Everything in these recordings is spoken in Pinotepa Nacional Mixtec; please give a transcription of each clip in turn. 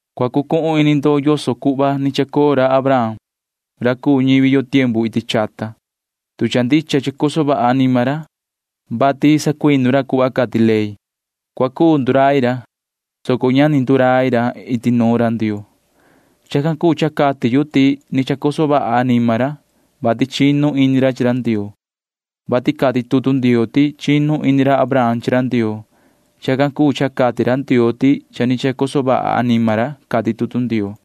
Cua cucuhun ini ndo yoso cuhva ni chacoo ra Abraham ra cuu ñivi yo iti chata tiempu chahnu. Tu cha ndicha chacoso vaha anima ra, vati sacuinu ra cuhva cati ley, cua cuu ndurai ra, soco ña ni cuu ndurai ra iti nuun ra Ndioo. [Chacan cuu cha cati yu ti ni chacoso vaha anima ra, vati chinu ini ra chi ra Ndioo,] vati cati tutu Ndioo ti chinu ini ra Abraham chi ra Ndioo. Chacan cuu cha cati ra Ndioo ti cha ni chacoso vaha anima ra, cati tutu Ndioo.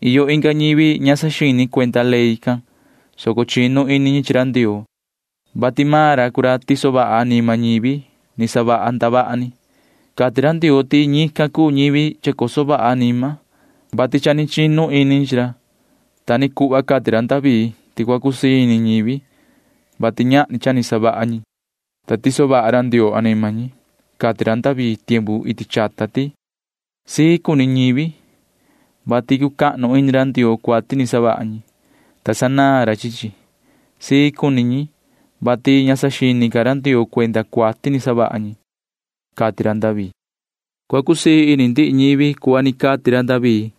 Iyo inga ñivi ña saxini cuenda ley can, soco chinu ini ñi chi ra Ndioo, vati maan ra cuu ra tiso vaha anima ñivi ni savaha ndavaha ni. Cati ra Ndioo ti ñican cuu ñivi chacoso vaha anima, vati cha ni chinu ini ñi chi ra. Ta ni cuhva cati ra David ti cua cusii ini ñivi, vati ñahni cha ni savaha ñi, ta tiso vaha ra Ndioo anima ñi. Cati ra David can iti chata ti: Sii cuni ñivi, vati cucahnu ini ra Ndioo cuati ni savaha ñi, ta sanaan ra chi chi. Sii cuni ñi, vati ña saxini ca ra Ndioo cuenda cuati ni savaha ñi, cati ra David. Cua cusii ini ndihi ñivi cuhva ni cati ra David.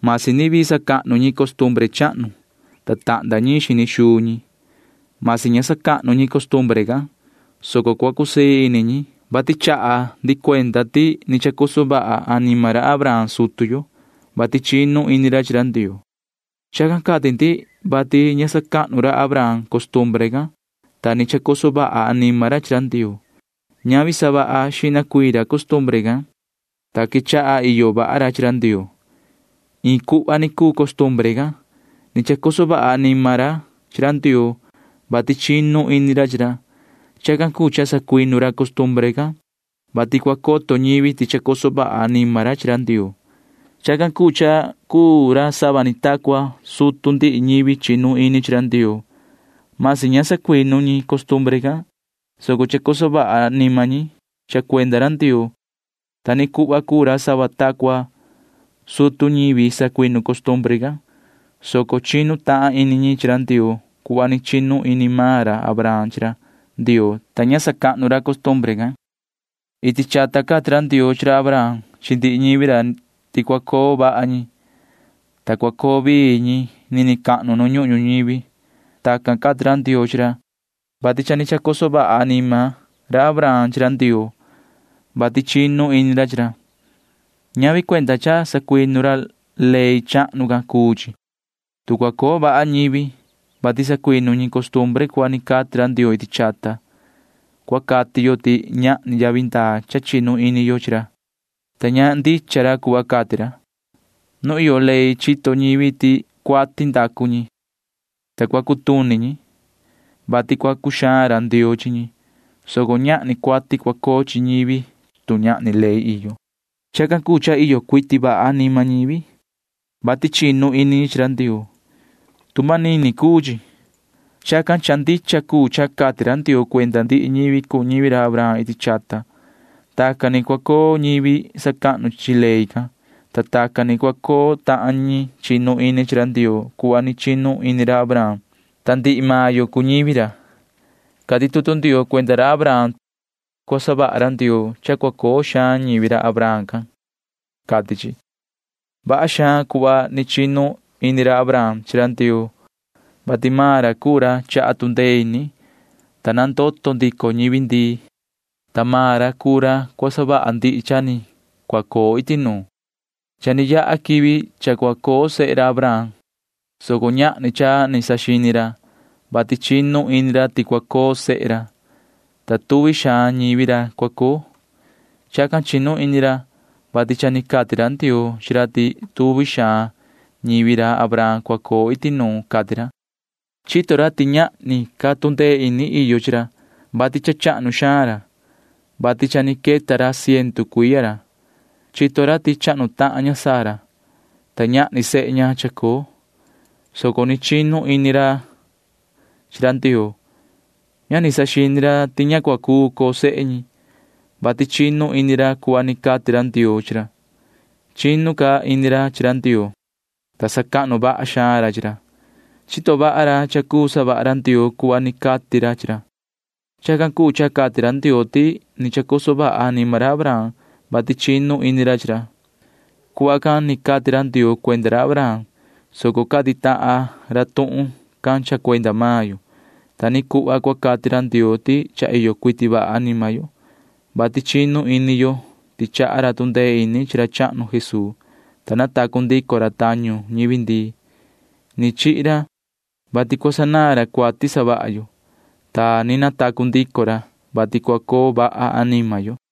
Masi ni vii sacahnu ñi costumbre chahnu, ta tahnda ñiin xini xuu ñi, masi ña sacahnu ñi costumbre can, soco cua cusii ini ñi, vati chaha ndi cuenda ti ni chacoso vaha anima ra Abraham sutu yo, vati chinu ini ra chi ra Ndioo. Chacan cati ndi, vati ña ta sacahnu ra Abraham costumbre can, ta ni chacoso vaha anima ra chi ra Ndioo. Ñavi ti cha ni sacuinu xihna ra costumbre, ta quechaha iyo vaha ra chi ra Ndioo. Iin cuhva ni cuu costumbre can. Ni chacoso vaha anima ra chi ra Ndioo, vati chinu ini ra chi ra. [Chacan cuu cha sacuinu ra costumbre can, vati cua coto ñivi ti chacoso vaha anima ra chi Ndioo.] Chacan cuu cha cuu ra sava ni ta cua sutu ndihi ñivi chinu ini chi ra Ndioo―masi ña sacuinu ñi costumbre can, soco chacoso vaha anima ñi cha cuenda ra Ndioo. Ta ni cuhva cuu ra sava ta cua sutu ñivi sacuinu costumbre can, soco chinu tahan ini ñi chi ra Ndioo cuhva ni chinu ini maan ra Abraham chi ra Ndioo, ta ña ta sacahnu ra costumbre can. Iti chata cati ra Ndioo chi ra Abraham chi ndihi ñivi ra ti cua coo vaha ñi, ta cua coo vii ñi nini cahnu nu ñuhun ñuñivi. Tacan cati ra Ndioo chi ra, vati cha ni chacoso vaha anima ra Abraham chi ra Ndioo, vati chinu ini ra chi ra. Ñavi cuenda cha sacuinu ra ley chahnu can cuu chi. Tu cua coo vaha ñivi, vati sacuinu ñi costumbre ni cuhva ni cati ra Ndioo iti chata, cua cati yo ti ñahni yavi ndaa cha chinu ini yo chi ra, ta ña ndicha ra cuhva cati ra. Nu iyo ley chito ñivi ti cuati ndacu ñi, ta cua cutuni ñi, vati cua cuxaan ra Ndioo chi ñi, soco ñahni cuati cua coo chi ñivi, tu ñahni ley iyo. Chacan cuu cha iyo cuiti vaha anima ñivi, vati chinu ini ñi chi ra Ndioo. Tu manini cuu chi. Chacan cuu cha cha ndicha cuu cha cati ra Ndioo cuenda ndihi ñivi cuu ñivi ra Abraham iti chata. Tacan ni cua coo ñivi sacahnu chi ley can, ta tacan ni cua coo tahan ñi chinu ini chi ra Ndioo cuhva ni chinu ini ra Abraham, ta ndihi maan yo cuu ñivi ra. Cati tutu Ndioo cuenda ra Abraham ti cua savaha ra Ndioo cha cua coo xaan ñivi ra Abraham can, cati chi. Vaha xaan cuhva ni chinu ini ra Abraham chi ra Ndioo, vati maan ra cuu ra chaha tu ndee ini, ta nandoto ndico ñivi ndii, ta maan ra cuu ra cua savaha ndihi cha ni cua coo iti nuun. Cha ni yaha quivi cha cua coo sehe ra Abraham, soco ñahni cha ni saxini ra, vati chinu ini ra ti cua coo sehe ra, ta tuvi xaan ñivi ra cua coo. Chacan chinu ini ra, vati cha ni cati ra Ndioo chi ra ti tuvi xaan ñivi ra Abraham cua coo iti nuun, cati ra. Chito ra ti ñahni ca tu ndee ini iyo chi maan ra, vati cha chahnu xaan ra, vati cha ni queta ra iin ciendu cuiya ra. Chito ra ti chahnu tahan ña Sara, ta ñahni sehe ña chacoo, soco ni chinu ini ra chi ra Ndioo. Ña ni saxini ra ti ña cua cuu coo sehe ñi, vati chinu ini ra cuhva ni cati ra Ndioo chi ra. Nihin ca chinu ini ra chi ra Ndioo, ta sacahnu vaha xaan ra chi ra. Chito vaha ra ti cua cuu savaha ra Ndioo cuhva ni cati ra chi ra. Chacan cuu cha cati ra Ndioo ti ni chacoso vaha anima ra Abraham, vati chinu ini ra chi ra. Chacan ni cati ra Ndioo cuenda ra Abraham, soco cati tahan ra tuhun can cha cuenda maan yo. Ta ni cuhva cua cati ra Ndioo ti cha iyo cuiti vaha anima yo, vati chinu ini yo ti chaha ra tu ndee ini chi ra chahnu Jesuu, ta natacu ndico ra tañu ñivi ndii. Ni chihi ra, vati cua sanaan ra cuati savaha yo, ta ni natacu ndico ra, vati cua coso vaha anima yo.